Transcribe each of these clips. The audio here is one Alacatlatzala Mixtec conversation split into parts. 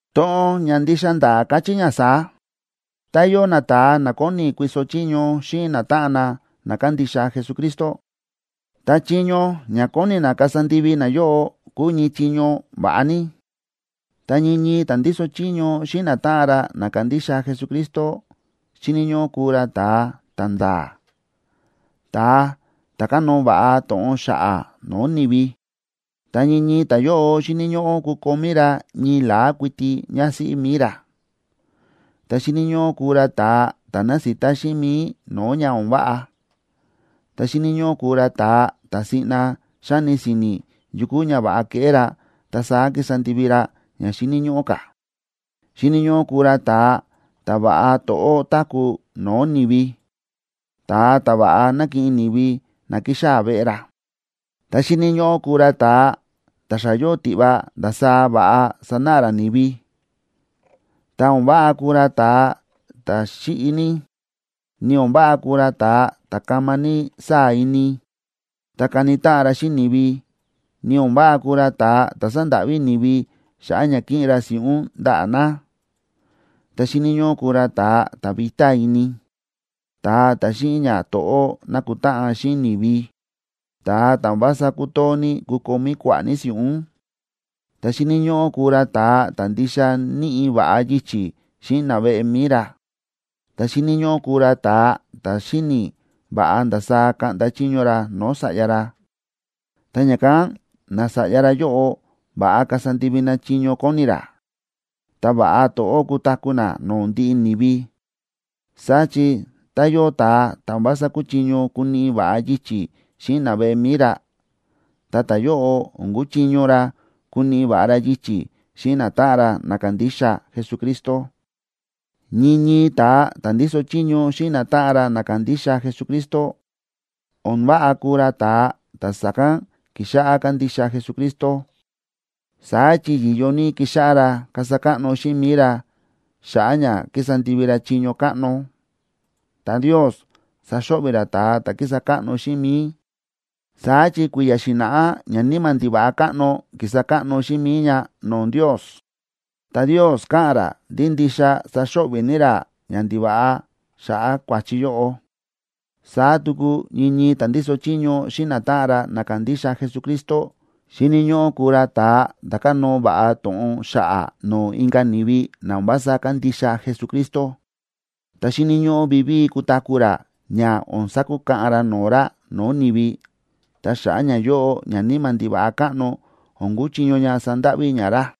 To̱ꞌon ña ndixa nda̱a̱ káchí ña saá: Tá yóo nata̱a na kóni kuiso chiño xíꞌin natáꞌan na na kándixa Jesucristo, ta chiño ña kóni na kasa ndivi nayóꞌo kúu ñii chiño va̱ꞌa ní. Ta ñii ñii ta̱ ndíso chiño xíꞌin natáꞌan ra na kándixa Jesucristo xíni̱ ñóꞌó kuu ra ta̱a ta̱nda̱a̱, ta̱a ta̱ kánóo va̱ꞌa to̱ꞌon xa̱ꞌa̱ no̱o̱ ni̱vi. Ta ñii ñii ta̱yóꞌo xíni̱ ñóꞌó kukomí ra ñii la̱á kuiti ñásíꞌí mi̱i ra. Ta xíni̱ ñóꞌó kuu ra ta̱a ta̱ násita xíꞌin mi̱i no̱o̱ ña o̱n váꞌa, ta xíni̱ ñóꞌó kuu ra ta̱a ta̱ siꞌna xáni si̱ni̱ yu kúu ña va̱ꞌa keꞌé ra, ta saá kísa ndivi ra ña xíni̱ ñóꞌó ka̱. Xíni̱ ñóꞌó kuu ra ta̱a ta̱ va̱ꞌa to̱ꞌó táku̱ no̱o̱ ni̱vi, ta̱a ta̱ va̱ꞌa nákiꞌin ni̱vi na kíxaa̱ veꞌe ra. Ta xíni̱ ñóꞌó kuu ra ta̱a ta̱ xa yóo tiꞌva ndasaá va̱ꞌa sanáꞌa ra ni̱vi. Ta o̱n váꞌa kuu ra ta̱a ta̱ xíꞌi ní, ni o̱n váꞌa kuu ra ta̱a ta̱ kama ní sáa̱ ini, ta káni táꞌan ra xíꞌin ni̱vi, ni o̱n váꞌa kuu ra ta̱a ta̱ sándáꞌví ni̱vi xa̱ꞌa̱ ña kiꞌin ra si̱ꞌún ndaꞌa̱ na. Ta xíni̱ ñóꞌó kuu ra ta̱a ta̱ vitá ini, ta̱a ta̱ xíꞌin ñato̱ꞌó nákutáꞌan xíꞌin ni̱vi, ta̱a ta̱ o̱n vása kútoo ní kukomí kua̱ꞌa̱ ní si̱ꞌún. Ta xíni̱ ñóꞌó kuu ra ta̱a ta̱ ndixa níꞌi va̱ꞌa yichi̱ xíꞌin naveꞌe mi̱i ra, ta xíni̱ ñóꞌó kuu ra ta̱a ta̱ xíni̱ va̱ꞌa ndasaá kaꞌnda chiño ra no̱o̱ sa̱ꞌya ra, ta ña̱kán nasa̱ꞌya ra yóꞌo va̱ꞌa kasa ndivi na chiño kóni ra, ta va̱ꞌa to̱ꞌó kutaku̱ na no̱o̱ ndiꞌi ni̱vi. Saá chi tá yóo ta̱a ta̱ o̱n vása kúchiño kuniꞌi va̱ꞌa yichi̱ xíꞌin naveꞌe mi̱i ra, ta ta̱yóꞌo o̱n kuchiño ra kuniꞌi va̱ꞌa ra yichi̱ xíꞌin natáꞌan ra na kándixa Jesucristo. Ñii ñii ta̱a ta̱ ndíso chiño xíꞌin natáꞌan ra na kándixa Jesucristo, o̱n váꞌa kuu ra ta̱a ta̱ sa̱kán ki̱xáꞌá kándixa Jesucristo. Saá chi yi̱yo ní kixáꞌá ra kasa káꞌno xíꞌin mi̱i ra xa̱ꞌa̱ ña kísa ndivi ra chiño káꞌno, ta Ndios saxo̱ꞌvi̱ ra ta̱a ta̱ kísa káꞌno xíꞌin mi̱i. Saá chi kui̱ya̱ xi̱na̱ꞌá ñaníma̱ ndiva̱ꞌa káꞌno ki̱sa káꞌno xíꞌin mi̱i ña no̱o̱ Ndios, ta Ndios káꞌa̱n ra ndí ndixa saxo̱ꞌvi̱ ní ra ñandiva̱ꞌa xa̱ꞌa̱ kua̱chi yóꞌo. Saá tuku ñii ñii ta̱ ndíso chiño xíꞌin natáꞌan ra na kándixa Jesucristo xíni̱ ñóꞌó kuu ra ta̱a ta̱ kánóo va̱ꞌa to̱ꞌon xa̱ꞌa̱ no̱o̱ inka̱ ni̱vi na o̱n vása kándixa Jesucristo. Ta xíni̱ ñóꞌó vivíi kutaku̱ ra ña o̱n sakukaꞌan ra no̱o̱ ra no̱o̱ ni̱vi, ta xa̱ꞌa̱ ñayóꞌo ñaníma̱ ndiva̱ꞌa káꞌno o̱n kuchiño ña sandáꞌví ña ra.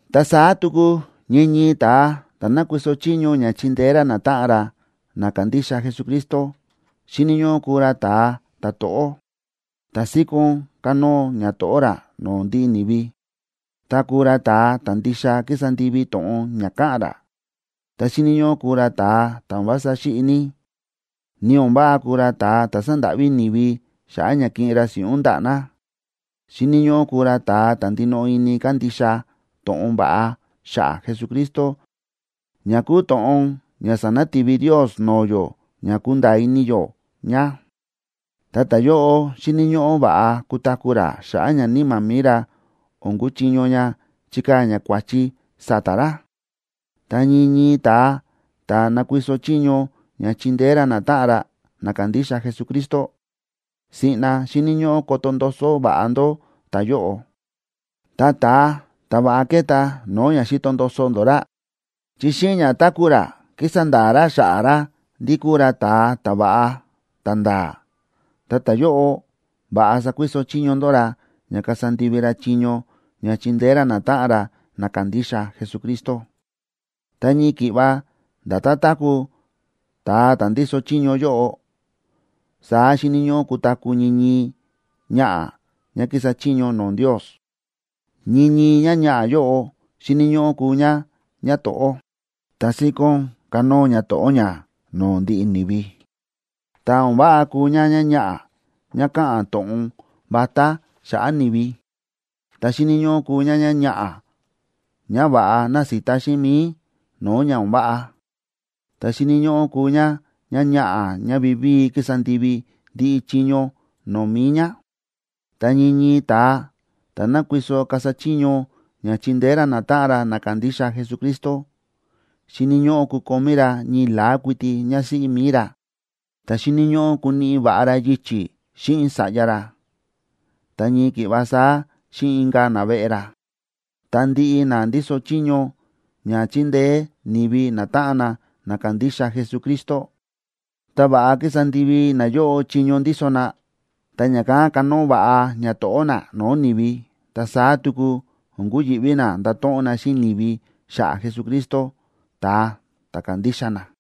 Ta saá tuku ñii ñii ta̱a ta̱ nákuiso chiño ña chindeé ra natáꞌan ra na kándixa Jesucristo xíni̱ ñóꞌó kuu ra ta̱a ta̱to̱ꞌó, ta síkón kánóo ñato̱ꞌó ra no̱o̱ ndiꞌi ni̱vi, ta kuu ra ta̱a ta̱ ndixa kísa ndivi to̱ꞌon ña káꞌa̱n ra. Ta xíni̱ ñóꞌó kuu ra ta̱a ta̱ o̱n vása xíꞌi ní, ni o̱n váꞌa kuu ra ta̱a ta̱ sándáꞌví ni̱vi xa̱ꞌa̱ ña kiꞌin ra si̱ꞌún ndaꞌa̱ na. Xíni̱ ñóꞌó kuu ra ta̱a ta̱ ndinoꞌo ini kándixa to̱ꞌon va̱ꞌa xa̱ꞌa̱ Jesucristo ña kúu to̱ꞌon ña sa̱nati̱vi Ndios no̱o̱ yó ña kundaa ini yó ña. Ta ta̱yóꞌo xíni̱ ñóꞌó va̱ꞌa kutaku̱ ra xa̱ꞌa̱ ña níma̱ mi̱i ra o̱n kuchiño ña chikaa̱ ña kua̱chi sa̱ta̱ ra. Ta ñii ñii ta̱a ta̱ nakuiso chiño ña chindeé ra natáꞌan ra na kándixa Jesucristo, siꞌna xíni̱ ñóꞌó koto ndoso va̱ꞌa ndó ta̱yóꞌo. Ta ta̱a ta̱ va̱ꞌa keta no̱o̱ ña xi̱to ndoso ndó ra, chi xíꞌin ña táku̱ ra kísa nda̱a̱ ña xa̱ꞌa̱ ra ndí kúu ra ta̱a ta̱va̱ꞌa, ta̱nda̱a̱, ta ta̱yóꞌo, va̱ꞌa sakuiso chiño ndó ra ña kasa ndivi ra chiño ña chindeé ra natáꞌan ra na kándixa Jesucristo. Ta ñii ki̱ꞌva nda̱tán táku̱ ta̱a ta̱ ndíso chiño yóꞌo, saá xíni̱ ñóꞌó kutaku̱ ñii ñii ñaꞌa̱ ñá kísa chiño no̱o̱ Ndios. Ñii ñii ñáñaꞌa̱ yóꞌo xíni̱ ñóꞌó kuu ñá ñáto̱ꞌó, ta síkón kánóo ñato̱ꞌó ñá no̱o̱ ndiꞌi ni̱vi. Ta o̱n váꞌa kuu ñáñaꞌa̱ ñá káꞌa̱n to̱ꞌon vatá xa̱ꞌa̱ ni̱vi. Ta xíni̱ ñóꞌó kuu ñáñaꞌa̱ ñá va̱ꞌa násita xíꞌin mi̱i no̱o̱ ña o̱n váꞌa. Ta xíni̱ ñóꞌó kuu ñá ñáñaꞌa̱ ñá vivíi kísa ndivi ndiꞌi chiño no̱o̱ mi̱i ñá. Ta ñii ñii ta̱a ta̱ nákuiso kasa chiño ña chindeé ra natáꞌan ra na kándixa Jesucristo, xíni̱ ñóꞌó kukomí ra ñii la̱á kuiti ñásíꞌí mi̱i ra, ta xíni̱ ñóꞌó kuniꞌi va̱ꞌa ra yichi̱ xíꞌin sa̱ꞌya ra, ta ñii ki̱ꞌva saá xíꞌin inka̱ naveꞌe ra. Ta ndiꞌi na ndíso chiño ña chíndeé ni̱vi natáꞌan na na kándixa Jesucristo, tá va̱ꞌa kísa ndivi nayóꞌo chiño ndíso na, ta ña̱kán kanóo va̱ꞌa ñato̱ꞌó na no̱o̱ ni̱vi, ta saá tuku o̱n kuyi̱ꞌví na ndato̱ꞌon na xíꞌin ni̱vi xa̱ꞌa̱ Jesucristo, ta̱a ta̱ kándixa na.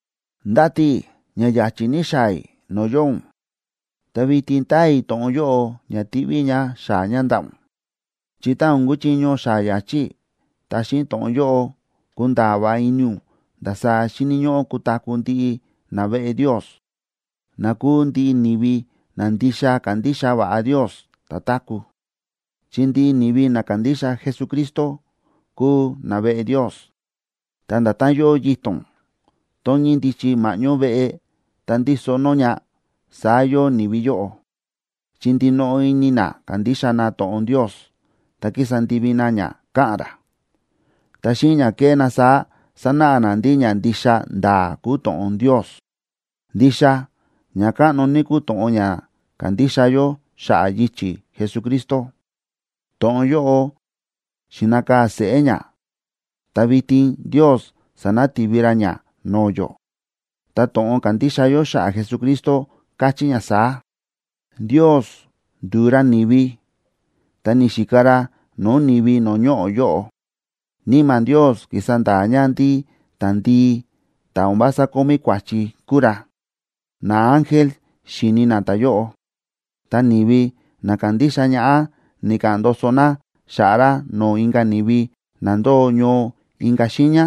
Ndáti i̱ ña ya̱chi̱ ní xaa̱ i̱ no̱o̱ yóo ún, ta vitin táa i̱ to̱ꞌon yóꞌo ña tiꞌví i̱ ña xaa̱ ña ndaꞌa̱ ún, chi tá o̱n kuchiño xaa̱ ya̱chi̱ i̱, ta xíꞌin to̱ꞌon yóꞌo kunda̱a̱ va̱ꞌa ini ún ndasaá xíni̱ ñóꞌó kutaku̱ ndiꞌi naveꞌe Ndios, na kúu ndiꞌi ni̱vi na ndixa kándixa va̱ꞌa Ndios ta̱táku̱. Chi ndiꞌi ni̱vi na kándixa Jesucristo kúu naveꞌe Ndios, ta nda̱tán yóo yito̱n tón ñíndichi ma̱ꞌñó veꞌe, ta ndíso nó ña, saá yóo ni̱vi yóꞌo, chi ndinoꞌo ini na kándixa na to̱ꞌon Ndios, ta kísa ndivi na ña káꞌa̱n ra. Ta xíꞌin ña kéꞌé na saá, sánáꞌa na ndí ña ndixa nda̱a̱ kúu to̱ꞌon Ndios. Ndixa ña káꞌno ní kúu to̱ꞌon ña kándixa yó xa̱ꞌa̱ yichi̱ Jesucristo. To̱ꞌon yóꞌo xi̱nakaa̱ seꞌé ña, ta vitin Ndios sa̱nati̱vi ra ña no̱o̱ yó. Ta to̱ꞌon kándixa yó xa̱ꞌa̱ Jesucristo káchí ña saá: Ndios ndu̱u ra ni̱vi, ta ni̱xika ra no̱o̱ ni̱vi no̱o̱ ñoꞌo̱ yóꞌo. Níma̱ Ndios ki̱sa nda̱a̱ ña ndí ta̱ndii, ta̱ o̱n vása kómí kua̱chi kúu ra. Naángel xi̱ni na ta̱yóꞌo. Ta ni̱vi na kándixa ñaꞌá ni̱ka̱ꞌa̱n ndoso na xa̱ꞌa̱ ra no̱o̱ inka̱ ni̱vi na ndóo ñoo inka̱ xiiña,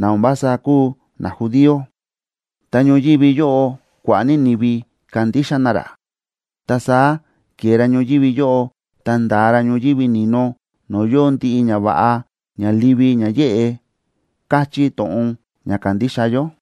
na o̱n vása kúu najudío. Ta ñoyívi yóꞌo kua̱ꞌa̱ ní ni̱vi ka̱ndixa na ra. Ta saá ke̱e ra ñoyívi yóꞌo, ta nda̱a ra ñoyívi ni̱no, no̱o̱ yóo ndiꞌi ñava̱ꞌa ña livi ña yéꞌe, kachí to̱ꞌon ña kándixa yó.